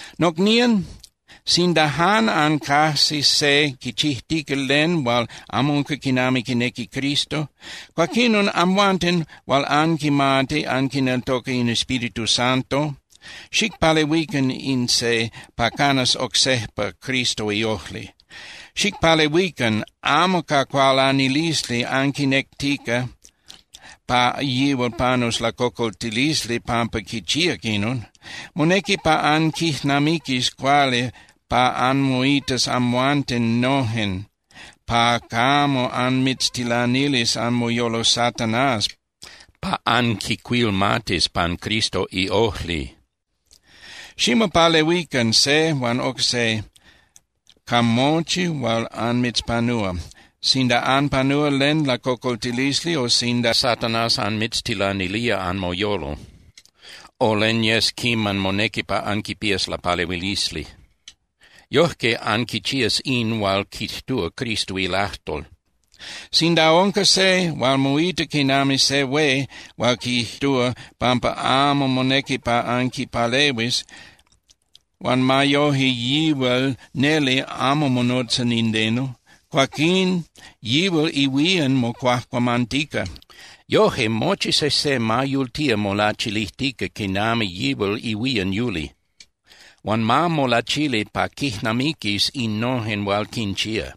Nocnían, sinda jan ancajsis se quichijtica len hual amo unca quinami quinequi Cristo, cuaquinon amhuanten hual anquimati anquineltoca in Espíritu Santo, xicpalehuican in se pa canas oc sejpa Cristo iojli. Xicpalehuican amo ca cualanilisli anquinectica pa yihual panus lacocoltilisli pampa quichíac inon. Monequi pa anquijnamiquis cuali pa anmoitas amhuanten nojen pa camo anmitztilanilis anmoyolo Satanás pa anquicuilmatis pan Cristo iojli. Ximopalehuican se huan oc se ca mochi hual anmitzpanúa, sinda anpanúa len lacocoltilisli o sinda Satanás anmitztilanilía anmoyolo, o len yes quiman monequi pa anquipías lapalehuilisli. Yojque anquichías in hual quijtúa Cristo ilajtol. Sinda unca se hual moita quinami se hué hual quijtúa pampa amo monequi pa anquipalehuis, huan ma yoje yihual neli amo monotza nindeno, cuaquín yihual ihuían mocuajcuamantica. Yoje mochi sejse ma yultía molachilijtica quinami yihual ihuían yuli. Huan ma molachili pa quijnamiquis innojen hual quinchía.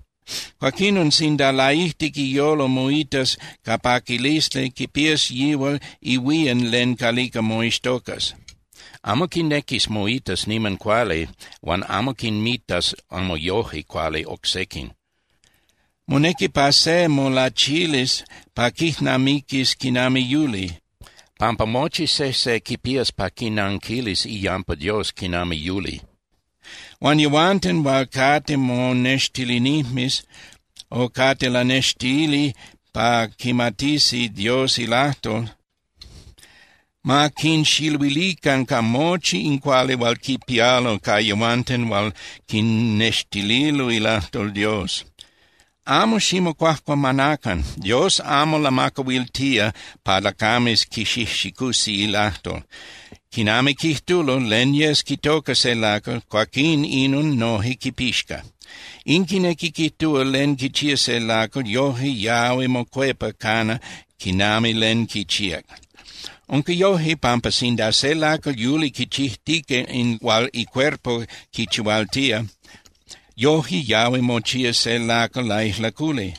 Cuaquinon sinda laijtic iyolo moitas ca paquilisli, quipías yihual ihuían len calica moixtocas. Amo quinequis moitas niman cuali huan amo quinmitas amo yoje cuali oc sequin. Monequi pa se molachilis pa quijnamiquis quinami yuli, pampa mochi sejse quipías pa quinanquilis iyampa Dios quinami yuli. Huan yehuanten hual cate monextilinijmes o cate lanextili pa quimatisi Dios ilajtol, ma quinxiluilican ca mochi in cuali hual quipialo ca yehuanten hual quinnextililo ilajtol Dios. Amo ximocuajcuamanacan. Dios amo lamacahuiltía pa lacames quixijxicusi ilajtol. Quinami quijtulo, len yes quitoca se lacal, cuaquín inon noje quipixca. In quinequi quijtúa len quichía se lacal, yoje yahui mocuepa cana quinami len quichíac. Unca yoje, pampa sinda se lacal yuli quichijtica in hual icuerpo quichihualtía, yoje yahui mochía se lacal laijlaculi.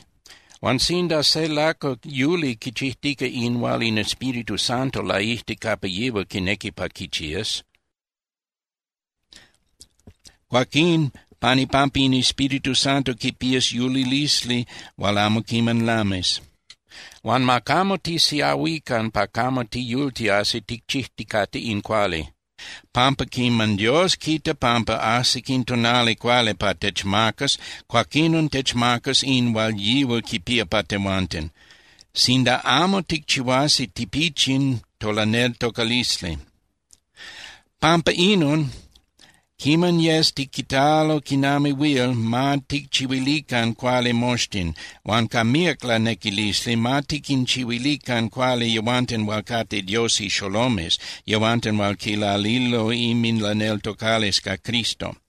Huan sinda se lacal yuli quichijtica in hual in Espíritu Santo laijtic capa yihual quinequi pa quichías, cuaquín pan ipampa in Espíritu Santo quipías yulilisli hual amo quiman lamis. Huan ma camo tisiahuican pa camo tiyultiasi ticchijticate in cuali, pampa quiman Dios quita pampa ajsic in tonali cuali pa techmacas, cuaquinon techmacas in hual yihual quipía pa tehuanten, sinda amo ticchihuasi tipichin tolaneltocalisli. Pampa inon, quiman yes tiquitalo quinami huil, ma ticchihuilican cuali moxtin. Huan ca míac lanequilisli, ma tiquinchihuilican cuali yehuanten hual cate Dios ixolomes, yehuanten hual quilalilo inminlaneltocalisli ca Cristo.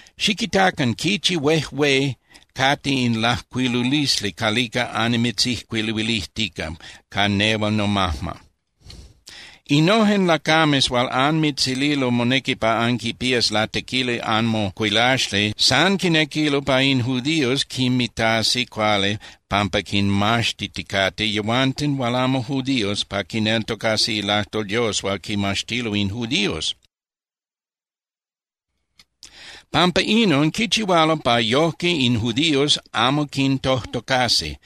Xiquitacan quichi huejué cate in lajcuilulisli calica annimitzijcuiluilijtica ca nehual nomajma. Innojen lacames hual anmitzililo monequi pa anquipías latequili anmocuilaxli san quinequilo pa in judíos quinmitasi cuali pampa quinmaxtiticate yehuanten hual amo judíos pa quineltocasi ilajtol Dios hual quimaxtilo in judíos. Pampa inon quichihualo pa yojque in judíos amo quintojtocasi.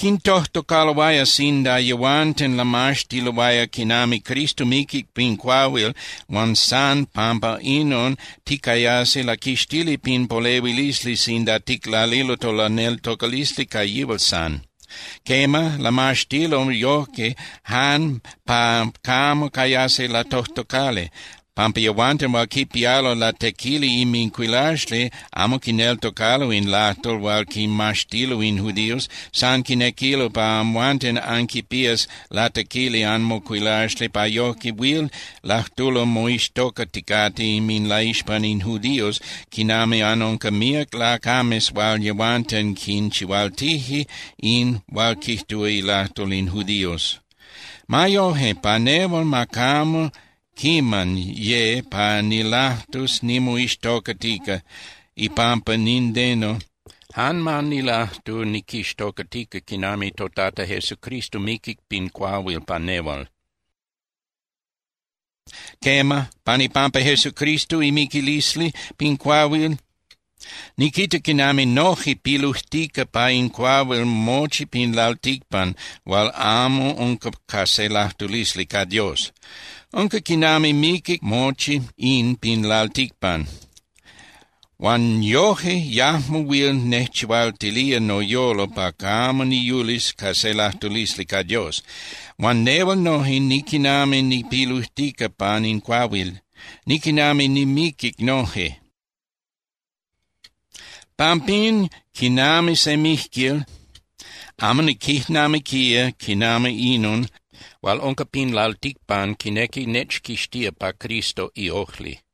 Quintojtocaloaya sinda yehuanten lamaxtiloaya quinami Cristo miquic pin cuahuil huan san pampa inon ticayasi laquixtili pin polehuilisli sinda ticlalilo tolaneltocalisli ca yihual san. Quema, lamaxtilo yojque jan pa camo cayasi latojtocali, pampa yehuanten hual quipialo latequili inmincuilaxli amo quineltocalo in lajtol hual quimaxtilo in judíos, san quinequilo pa amhuanten anquipías latequili anmocuilaxli pa yojque huil lajtulo moixtocaticate inminlaixpan in judíos quinami anunca míac lacames hual yehuanten quinchihualtije in hual quijtúa ilajtol in judíos. Ma yoje, pa nehual, ma camo quiman ye pa nilajtus nimoixtocatica ipampa nindeno, jan ma nilajtu niquixtocatica quinami toTata Jesucristo miquic pin cuahuil pa nehual. Quema, pan ipampa Jesucristo imiquilisli pin cuahuil, niquita quinami noje pilujtica pa in cuahuil mochi pin lalticpan hual amo unca ca se lajtulisli ca Dios. Unca quinami miquic mochi in pin lalticpan. Huan yoje yajmo huil nejchihualtilía noyolo pa camo niyulis ca se lajtulisli ca Dios. Huan nehual noje niquinami nipilujtica pan in cuahuil, niquinami nimiquic noje. Pampín, quinami se mijquil, amo niquijnamiquía quinami inon hual unca pin lalticpan quinequi nechquixtía pa Cristo iojli.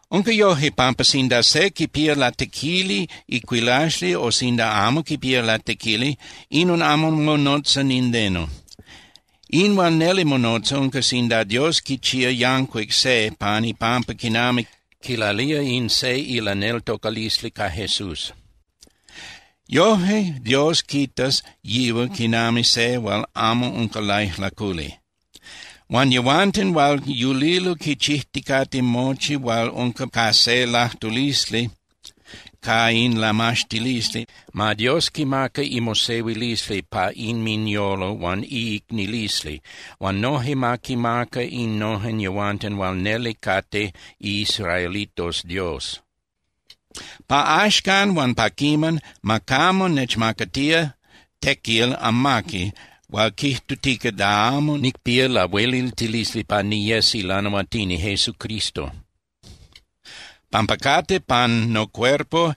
Unca yoje, pampa sinda se quipía latequili icuilaxli o sinda amo quipía latequili, inon amo monotza nindeno. In hual neli monotza unca sinda Dios quichía yancuic se pan ipampa quinami quilalía in se ilaneltocalisli ca Jesús. Yojque Dios quitas yihual quinami se hual amo unca laijlaculi. Huan yehuanten hual yulilo quichijticate mochi hual unca ca se lajtulisli ca in lamaxtilisli, ma Dios quimaca imosehuilisli pa inminyolo huan iicnililisli, huan noje ma quinmaca innojen yehuanten hual neli cate iisraelitos Dios. Pa axcan huan pa quiman, ma camo nechmacatía tequil amaqui hual quijtutica da amo nicpía lahueliltilisli pa niyes ilanahuatini Jesucristo, pampa cate pan nocuerpo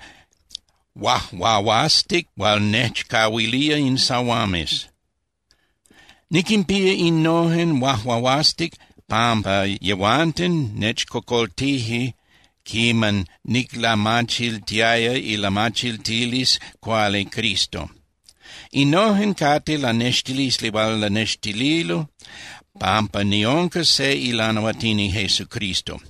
huajuahuastic hual nechcahuilije in sahuames. Niquinpía innojen huajuahuastic pampa yehuanten nechcocoltije quiman niclamachiltiaya ilamachiltilisli cuali Cristo. Innojen cate lanextilisli hual lanextililo pampa niunca se ilanahuatini Jesucristo.